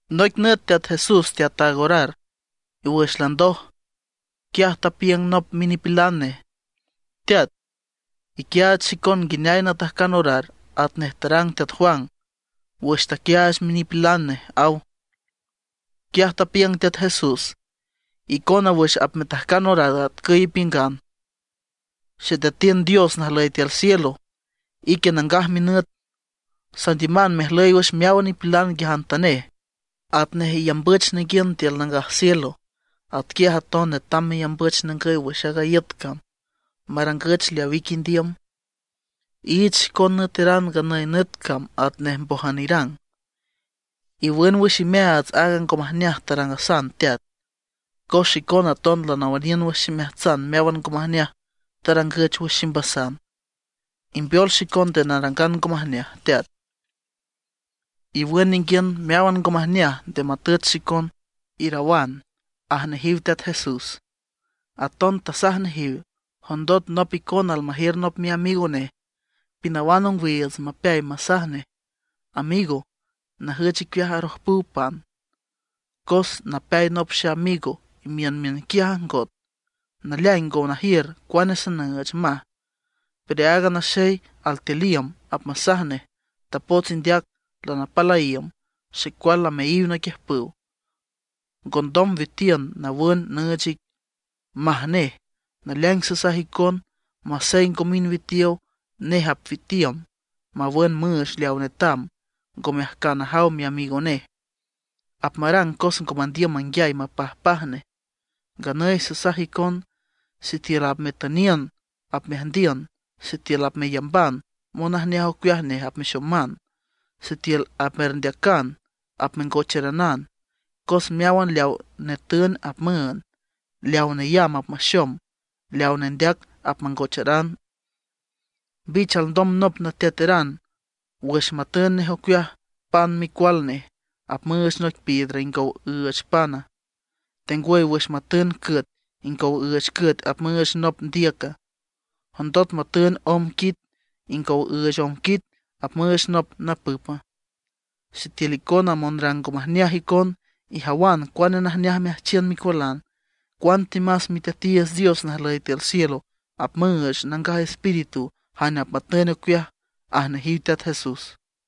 Noic nüt Teat Jesús teataag orar, y wüx landoj, quiaj tapiüng nop minipilan nej: ―Teat, iquiaach xicon nguineay natajcan orar atnej tarang teat Juan wüx taquiaach minipilan nej ―aw. Quiaj tapiüng Teat Jesús: ―Icona, wüx apmetajcan orar atcüy ipiüngan: Xeteatiün Dios najlüy tiül cielo, ique nangaj minüt. Sandiüman mejlüy wüx meáwan nipilan nguiajantanej. Atnej iyambüch ninguiün tiül nangaj cielo, atquiaj aton netam meyambüch ningüy wüx aaga iüt cam, marangüch leaw ique indiüm. Iich xicon nüeteran nganüy nüt cam atnej mbójan irang. Iwün wüx imeaats aaga ngo majneaj tarangasan Teat, cos xicona aton lanawüniün wüx ximeajtsan meáwan ngo majneaj tarangüch wüx ximbasan. Imbeol xicon nde narangan ngo majneaj, Teat, Iwün ninguiün meáwan ngo majneaj, nde matüch xicon, irawan ―aj nejiw Teat Jesús. Aton tasaj nejiw: ―Jondot nop icona almajiür nop miamigo nej pinawan ongwiiüts mapeay masaj nej: “Amigo, najüch icueaj arojpüw pan. Cos napeay nop xeamigo, imiün miünquiaj ajngot, naleaing ngo najiür cuane sanüüch”, maj. Pero aaga naxey altiül iüm, apmasaj nej: “Tapots indeac, lanapal a iüm. Xecual lameayiw naquiüjpüw, ngondom witiün nawün nüüch ic”, maj nej. Naleaing sasaj icon, masey ngo mind witiow, nej apwitiüm mawün müüch leaw netam, ngome ajcan ajaw miamigo nej, apmarang cos ngo mandiüm manguiay mapajpaj nej. Nganüy sasaj icon: Sitiül apmetüniün apmeajndiün; sitiül apmeyamban monajneaj ocueaj nej apmexoman; sitiül apmerndeacan apmengocheranan. Cos meáwan leaw netün apmüünd; leaw neyamb apmaxom; leaw nendeac apmangocharan. ’¿Mbich alndom nop nateateran wüx matün nej ocueaj pan micual nej, apmüüch noic piedra ingow üüch pana? ¿Tengwüy wüx matün cüet, ingow üüch cüet apmüüch nop ndiüca? ¿Jondot matün omb quit, ingow üüch omb quit apmüüch nop napüpa? Sitiül icona monrang ngo majneaj icon, ijawan cuane najneaj meajchiün micualan; cuantemas Miteatiiüts Dios najlüy tiül cielo apmüüch Nangaj Espíritu jane apmatün nej ocueaj ―aj nejiw Teat Jesús.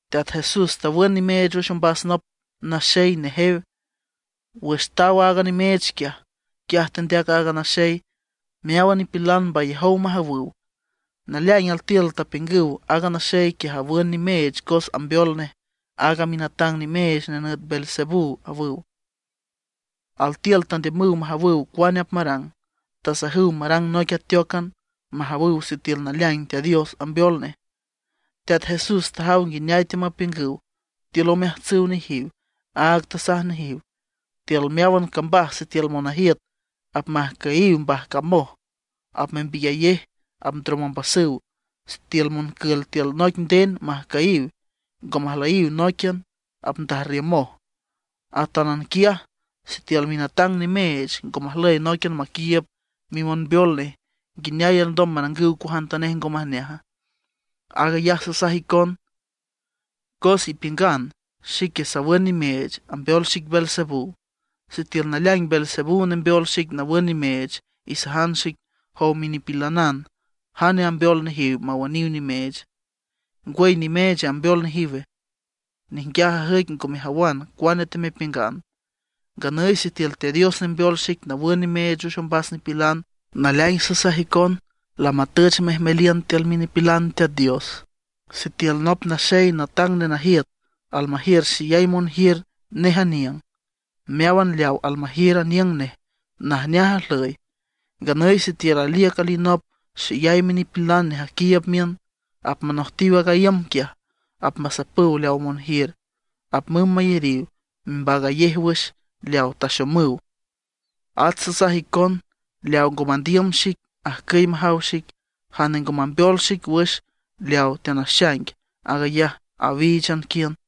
Teat Jesús tawün nimeech wüx ombas nop naxey nejew. Wüx taw aaga nimeech quiaj, quiaj tendeac aaga naxey. Meáwan nipilan mbayajow majawüw. Naleaing altiül tapiüngüw: ―Aaga naxey quiaj awün nimeech cos ambeol nej aaga minatang nimeech nenüt Beelzebú ―awüw. Altiül tandiümüw majawüw cuane apmarang, tasajüw marang noic ateócan majawüw sitiül naleaing Teat Dios ambeol nej. Teat Jesús tajaw nguineay teamapiüngüw tiül omeajtsüw nejiw, áag tasaj nejiw: ―Tiül meáwan cambaj sitiül monajiüt apmajcüyiw mbajcamoj, apmembiyayej apndrom ombasüw. Sitiül moncül tiül noic nden majcüyiw, ngo majlüyiw nóiquian, apndajrriümoj. Atánan quiaj sitiül minatang nimeech ngo majlüy nóiquian maquiiüb mimonbeol nej, ¿nguineay alndom marangüw cuajantanej ngo majneaja? Aag ayaj sasaj icon cos ipiüngan xique sawün nimeech, ambeol xic Beelzebú. Sitiül naleaing Beelzebú nembeol xic nawün nimeech, isajan xic, jow minipilanan, ¿jane ambeol nejiw mawüniw nimeech? ¿Ngwüy nimeech ambeol nejiwe? Ninguiaj ajüic ngo mejawan cuane temepiüngan. Nganüy sitiül Teat Dios nembeol xic nawün nimeech wüx ombas nipilan, naleaing sasaj icon lamatüch mejmeliün tiül minipilan Teat Dios. ’Sitiül nop naxey natang nenajiüt almajiür xeyay monjiür nej aniüng, meáwan leaw almajiür aniüng nej najneaj ajlüy. Nganüy sitiül aliüc alinop xeyay minipilan nej aquiiüb miün, apmanojtiw aaga iüm quiaj, apmasapüw leaw monjiür, apmümb mayariw membaagayej wüx leaw taxomüw. ’At sasaj icon, leaw ngo mandiüm xic, ajcüy majaw xic. Jane ngo mambeol xic wüx leaw teanaxaing, aag ayaj awíichan quiün.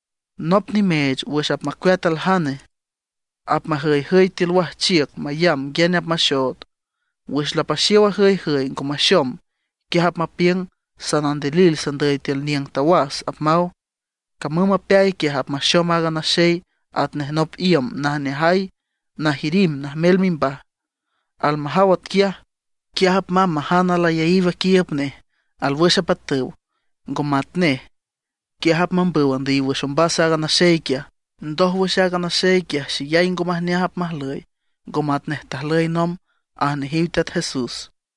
’Nop nimeech wüx apmacueat aljane, apmajüyjüy tiül wajchiüc mayamb nguiane apmaxood. Wüx lapaxiow ajüyjüy ngo maxom, quiaj apmapiüng: “Sanandilil sandüy tiül niüng tawas”, apmaw. Camüm mapeay quiaj, apmaxom aaga naxey atnej nop iüm najneajay najirimb najmel mimbaj. Almajaw atquiaj, quiaj apmamb majan alayaíw aquiiüb nej alwüx apatüw, ngo matnej. Quiaj apmambüw andüyiw wüx ombas a naxey quiaj. Ndójwüx aaga naxey quiaj xeyay ngo majneaj apmajlüy, ngo matnej tajlüy nomb ―aj nejiw Teat Jesús.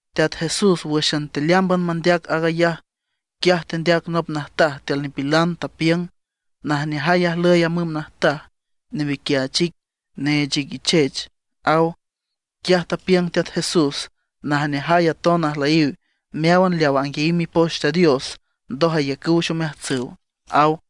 Teat Jesús wǘxan tealeámban mandeac aag ayaj, quiaj tendeac nop najtaj tiül nipilan, tapiüng: ―Najneajay ajlüy a müm najtaj newiquiach ic, neech ic ichech ―aw. Quiaj tapiüng Teat Jesús: ―¡Najneajay aton ajlüyiw meáwan leaw anguiayiw Mipoch Teat Dios ndoj ayacüw wüx omeajtsüw! ―aw.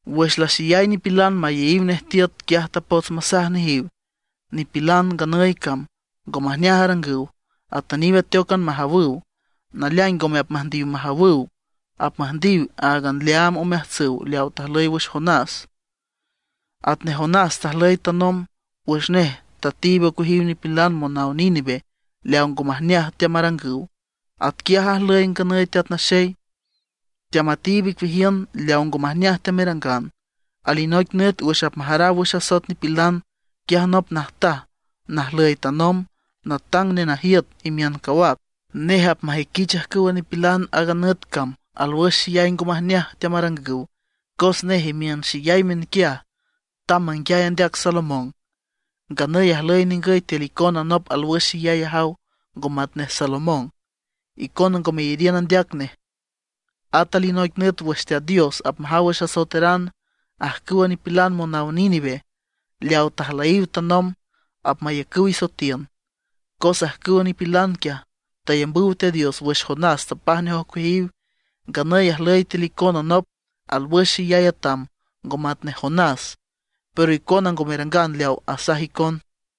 Wüx laxeyay nipilan mayeyiw nej tiüt, quiaj tapots masaj nejiw: ―Nipilan nganüy cam ngo majneaj arangüw, atüniw ateócan majawüw. Naleaing ngome apmüjndiw majawüw; apmüjndiw áagan leaam omeajtsüw leaw tajlüy wüx Jonás. Atnej Jonás tajlüy tanomb, wüx nej tatiib ocueajiw nipilan monaw Níneve leaw ngo majneaj teamarangüw, atquiaj ajlüy nganüy a Teat Naxey, teamatiib icueajiün leaw ngo majneaj teamerangan. Alinoic nüt wüx apmajaraw wüx asoet nipilan, quiaj nop najtaj najlüy tanomb, natang nenajiüt imiün cawac, nej apmajüiquich ajcüwa nipilan aaga nüt cam alwüx axeyay ngo majneaj teamarangüw; cos nej imiün xeyay miünquiaj tamb manguiay andeac Salomón. Nganüy ajlüy ningüy tiül icona nop alwüx xeyay ajaw ngo matnej Salomón, icona ngo meyariün andeac nej. At alinoic nüt wüx Teat Dios apmajaw wüx asoeteran, ajcüwa nipilan monaw Níneve leaw tajlüyiw tanomb apmayacüw isoetiün. Cos ajcüwa nipilan quiaj tayambüw Teat Dios wüx Jonás tapaj nej ocueajiw. Nganüy ajlüy tiül icona nop alwüx xeyay atam ngo matnej Jonás, pero icona ngo merangan leaw asaj icon.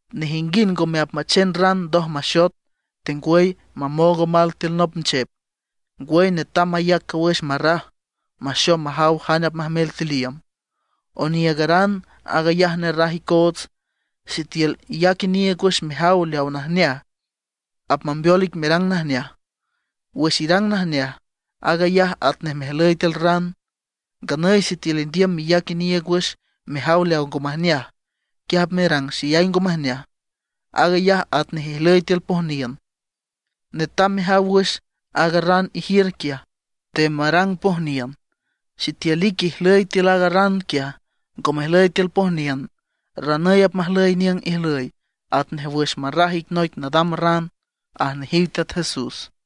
’Nejinguind ngome apmachen ran ndoj maxot, tengwüy mamoog omal tiül nop nchep. Ngwüy netam mayac cawüx marraj, maxom majaw jane apmajmel tiül iüm. Oniiügaran aag ayaj nerraj icoots. Sitiül iyac iniiüg wüx mejaw leaw najneaj, apmambeol ic merang najneaj. Wüx irang najneaj, aag ayaj atnej mejlüy tiül ran. Nganüy sitiül indiüm meyac iniiüg wüx mejaw leaw ngo majneaj, quiaj apmerang xeyay ngo majneaj; aag ayaj atnej ijlüy tiül pojniün. Netam mejaw wüx aaga ran ijiür quiaj, nde marang pojniün. Sitiül ique ijlüy tiül aaga ran quiaj, ngo mejlüy tiül pojniün, ranüy apmajlüy niüng ijlüy atnej wüx marraj ic noic nadam ran ―aj nejiw Teat Jesús.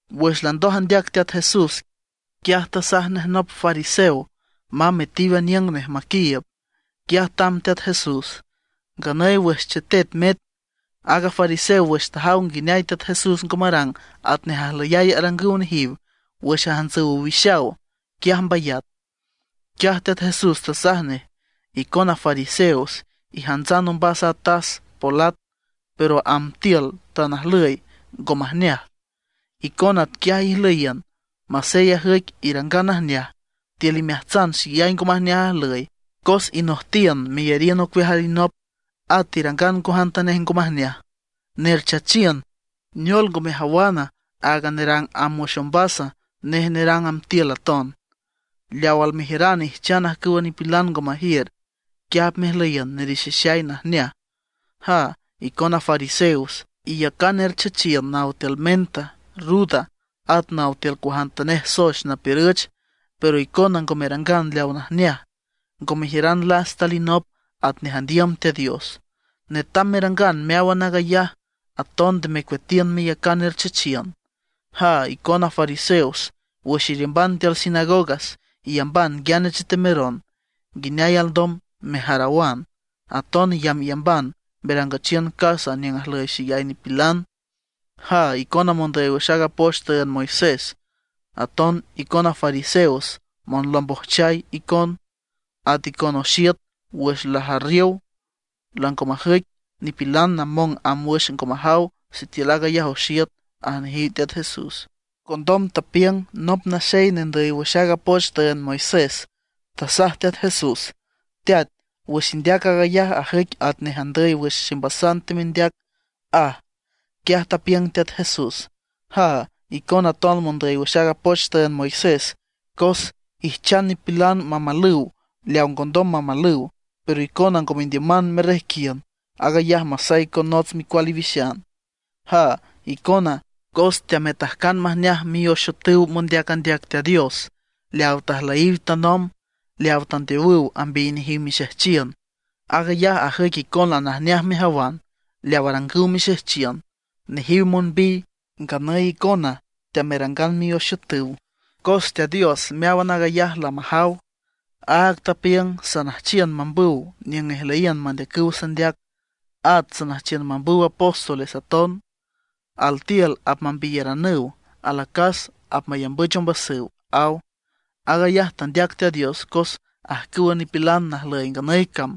Wüx landoj andeac Teat Jesús, quiaj tasaj nej nop fariseo mamb metiw aniüng nej maquiiüb. Quiaj tamb Teat Jesús. Nganüy wüx chetet met, aaga fariseo wüx tajaw nguineay Teat Jesús ngo marang atnej ajlüyay arangüw nejiw wüx ajantsüw owixaw, quiaj mbayat. Quiaj Teat Jesús tasaj nej: ―Icona fariseos ijantsan ombas a tas, polat, pero amb tiül tan ajlüy ngo majneaj. Icona atquiaj ijlüyiün, masey ajüic irangan najneaj, tiül imeajtsan xeyay ngo majneaj ajlüy, cos inojtiün meyariün ocueaj alinop, at irangan cuajantanej ngo majneaj. ¡Nerchachiün! ¿Neol ngo mejawana, aag nerang amb wüx ombas, nej nerang amb tiül aton? Leaw almejiüran ijchan ajcüwa nipilan ngo majiür. Quiaj apmejlüyiün nerixixay najneaj. ’¡Jaa, icona fariseos! Iyacan erchechiün naw tiül menta, ruda, at naw tiül cuajantanej soex napiürüch; pero icona ngo merangan leaw najneaj, ngo mejiüran lasta alinop atnej andiüm Teat Dios. Netam merangan meáwan aag ayaj, aton nde mecueatiün meyacan erchechiün. ’¡Jaa, icona fariseos! Wüx iriümban tiül sinagogas iyamban nguiane chetemeron, nguineay alndom mejarawan. Aton iyambyamban merangüchiün casa niüng ajlüy xeyay nipilan. ’¡Jaa, icona mondüy wüx aaga poch tüünd Moisés, aton icona fariseos! ¡Monlombojchay icon! At icon oxiüt wüx lajarriow, lango majüic, nipilan namong amb wüx ngo majaw sitiül aag ayaj oxiüt ―aj nejiw Teat Jesús. Condom tapiüng nop naxey nendüy wüx aaga poch tüünd Moisés, tasaj Teat Jesús: ―Teat, wüx indeac aag ayaj ajüic atnej andüy wüx ximbasan temendeac ―aj. Quiaj tapiüng Teat Jesús: ―¡Jaa, icona aton mondüy wüx aaga poch tüünd Moisés! Cos ijchan nipilan mamalüw leaw ngondom mamalüw; pero icona ngo mendiüman merrejquiün aag ayaj masey con nots micual iwixan. ’¡Jaa icona! Cos teametajcan majneaj mioxiütüw mondeac andeac Teat Dios leaw tajlüyiw tanomb, leaw tandeowüw ambiy nejiw mixejchiün. Aag ayaj ajüic icona najneaj mejawan leaw tarangüw mixejchiün; nejiw monbiy, nganüy icona teamerangan mioxiütüw. ’Cos Teat Dios meáwan aag ayaj lamajaw, áag tapiüng: “Sanüjchiw mambüw niüng ijlüyiün mandeacüw sandeac, at sanüjchiw mambüw apóstoles aton. Altiül apmambiyaranüw, alacas apmayambüch ombasüw”, aw. Aag ayaj tandeac Teat Dios cos ajcüwa nipilan najlüy nganüy cam,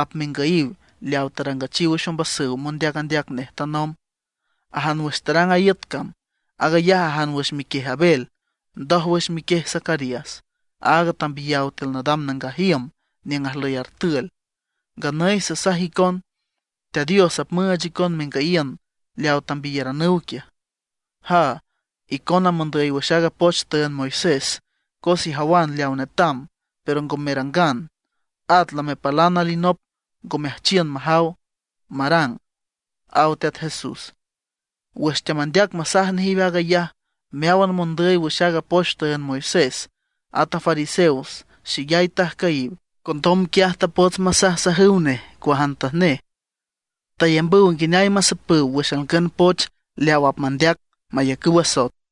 apmengüyiw leaw tarangüchiw wüx ombasüw mondeac andeac nej tanomb, ajan wüx tarang iüt cam. Aag ayaj ajan wüx miquiej Abel, ndójwüx wüx miquiej Zacarías, áag tambiyaw tiül nadam nangaj iüm niüng ajlüy artül. Nganüy sasaj icon, Teat Dios apmüüch icon mengüyiün leaw tambiyaranüw quiaj. ’¡Jaa, icona mondüy wüx aaga poch tüünd Moisés! Cos ijawan leawa netam, pero ngo merangan. At lamepálan alinop, ngo meajchiün majaw, marang ―aw Teat Jesús. Wüx teamandeac masaj nejiw aag ayaj, meáwan mondüy wüx aaga poch tüünd Moisés, at a fariseos xeyay tajcüyiw. Condom quiaj tapots masajsajüw nej cuajantanej. Tayambüw nguineay masapüw wüx alngün poch leaw apmandeac, mayacüw asoet.